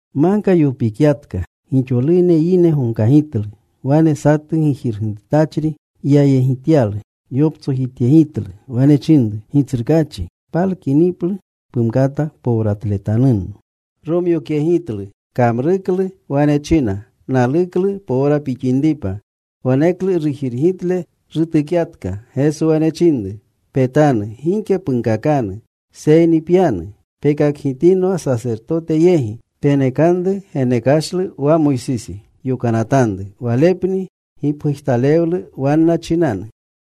Magka yopikyatka. Gixolune yine gomkagitlu. Wane satu gijirgitutachri yayegityalu. Yoptsojityegitlu. Wane chinru, “Gitsrukaachi, palukiniplu pumkata powratletanunno.” Romyokyegitlu. Kamruklu. Wane china, “Naluklu powra pixinripa.” Waneklu rujirgitle rutukyatka. Geso wane chinru, “Petanu. Gike punkakanu. Seyni pyanu. Pekakgitinwa sasertote yegi. Penekanru genekashlu wa Moysisi yokanatanru. Walepni gipgujtalewlu wanna chinanu.”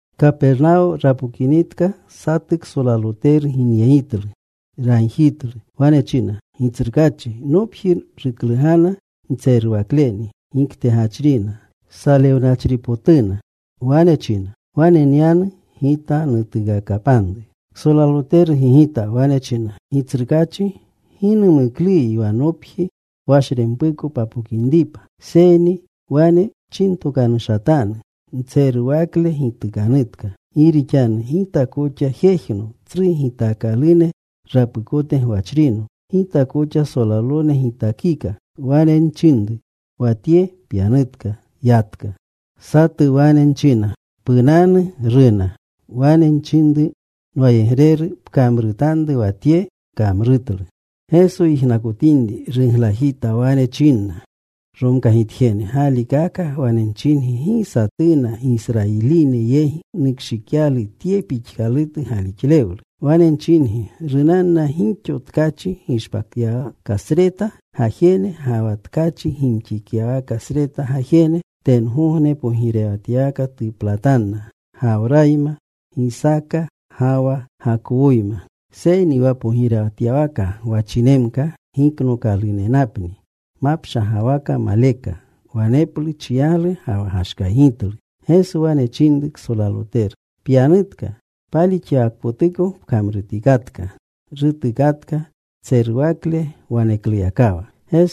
Kapernawo rapokinitka, satu ksolaloteru ginyegitlu. Ragjitlu. Wane china, “Gitsrukaachi, nopji ruklugana ntseruwakleni. Giktegachrina. Salewnachripotuna.” Wane china, “Wane nyanu Gita. Nutuukakapanru.” Ksolaloteru gigita. Wane china, “Gitsrukaachi, gi numukluyi wa nopji washrempuko papokinripa. Seyni wane pchinatokanushatanu. Ntseruwakle gitukanutka. Gi rixanu gita koxa jejno tsru gitaakalune rapukote gwachrino. Gita koxa solalone gitakika. Wane nchinru wa tye, ‘Pyanutka.’ Yatka. Satu wane nchina, ‘Punanu.’ Runa. Wane nchinru nwayegreru, ‘Pkamrutanru wa tye.’ Kamrutlu.” Geso yijnakotinri, ruglajita. Wane chinna romkagitjene: “Galikaka wane nchingi, gi satuna Gisrayiline yegi nukshikyalu tye pixkalutu galixlewlu. Wane nchingi, runanna gixo tkachi gishpatyawakasreta gajene ga wa tkachi gimxityawakasreta gajene. Tengogne pogirewatyawaka tuplatanna Gawrayma, Gisaaka, ga wa Gakowoyma. Seyni wa pogirewatyawaka gwachinemka giknookalunenapni mapshagawaka maleka. Waneplu chiyaglu ga wa gashkaygitlu.” Geso wane chinru ksolaloteru, “Pyanutka. Palixyawakpotuko pkamrutikatka.” Rutuukakatka tseruwakle wanekluyakawa.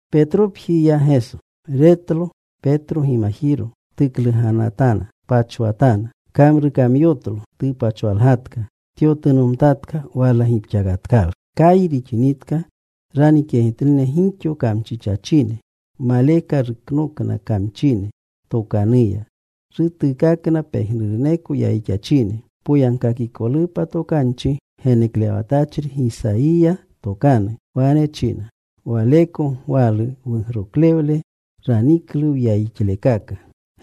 Petropji ya Geso. Retlo Petro gimajiro. Tukluganatana, tpachwatana. Kamrukamyotlo. Tupachwalgatka. Tyotunomtatka. Wala gipxakatkalu. Kayi rixinitka ranikyegitluna gixo kamchichachine. Maleka ruknokna kamchine tokanuya. Rutuukakna pejnuruneko yayixachine, poyagkakikolupa tokanchi geneklewatachri Gisayiya tokanu. Wane china: Waleko gwalu wugroklewle. Raniklu wyayixlekaka.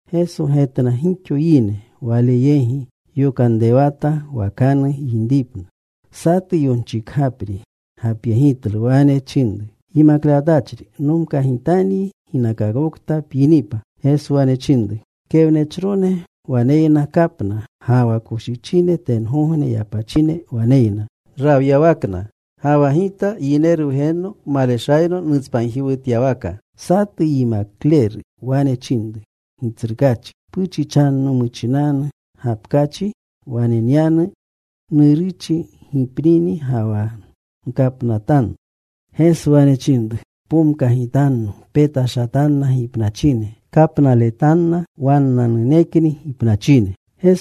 Geso getna gixo yine Wale yegi. Yokanrewata wakanu yinripna. Satu yonchikgapri gapyegitlu. Wane chinru, “Yimaklewatachri, nomkagitanyi ginakakokta pyinipa.” Geso wane chinru, “Kewnechrone waneyna kapna. Ga wa koshichine tengogne yapachine waneyna rawyawakna. Ga wa Gita Yineru Wgenno maleshayno nutspanjiwutyawaka.” Satu yimakleru wane chinru, “Gitsrukaachi puchichanno muchinanu gapkachi wane nyanu, nuruchi gipnini, ga wa nkapnamtanu.” Geso wane chinru, “Pomkagitanno. Petashatanna gipnachine kapnaletanna wannanunekni gipnachine.”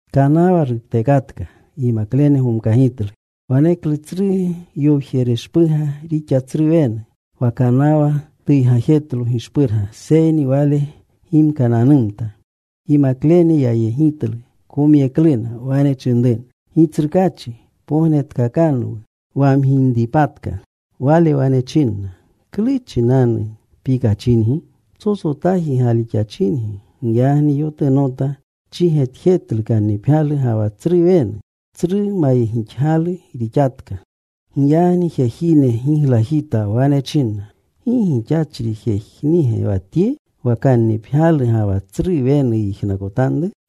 Kanawa ruptekatka. Yimaklene gomkagitlu. Waneklu tsru yowjereshpurga rixa tsru wenu. Wa kanawa tuygajetlo gishpurga. Seyni Wale gimkananumta. Yimaklene yayegitlu. Komyekluna. Wane chinruna, “¡Gitsrukaachi, pognetkakanwu! ¡Wamginripatka!” Wale wane chinna, “¿Klu chinanu pikachingi? Psotsotaji galixachingi.” Giyagni yotunota. Chigetjetlu kannipgyalu ga wa tsru wenu. Tsru mayegixgalu rixatka. Giyagni jejine giglajita. Wane chinna, “¿Gi gixachri jejnige wa tye? Wa kannipgyalu ga wa tsru wenu yijnakotanru.”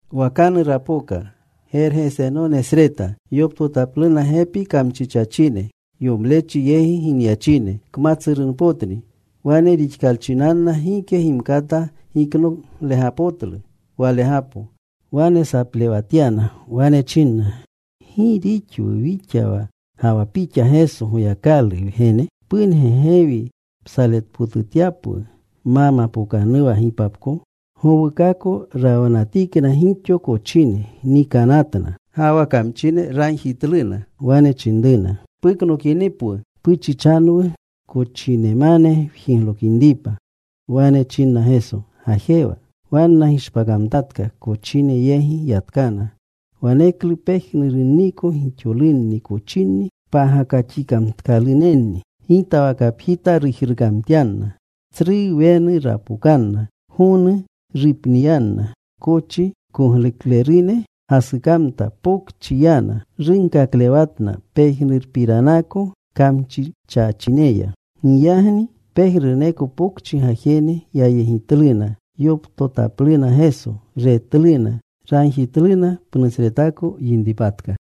Wakanu rapoka Gergesenonesreta. Yoptotapluna gepi kamchichachine, yomlechi yegi ginyachine. Kmatsurunpotni. Wane rixkalchinanna gike gimkata giknoglegapotlu walegapo. Wane saplewatyana. Wane chinna, “¿Gi rixwu wixa ga wa pixa, Geso, Goyakalu Wgene? ¿Punge gewi psaletpotutyapwu ma mapookanuwa gipapko?” Gowukako rawanatikna gixo kochine. Nikanatna. Ga wa kamchine ragjitluna. Wane chinruna, “Puknokinipwu, puchichanwu kochinemane wjiglokinripa.” Wane chinna Geso, “Gajewa.” Wanna gishpakamtatka. Kochine yegi yatkana. Waneklu pejnurunniko gixolunni kochinni pagakaxikamtkalunenni gitawakapjita rujrukamtyanna. Tsru wenu rapokanna. Gonu rupniyanna. Kochi kogluklerune gasukamta. Pokchi yana. Runkaklewatna pejnurpiranako kamchichachineya. Giyagni pejnuruneko pokchi gajene yayegitluna. Yoptotapluna Geso. Retluna. Ragjitluna pnusretako yinripatka.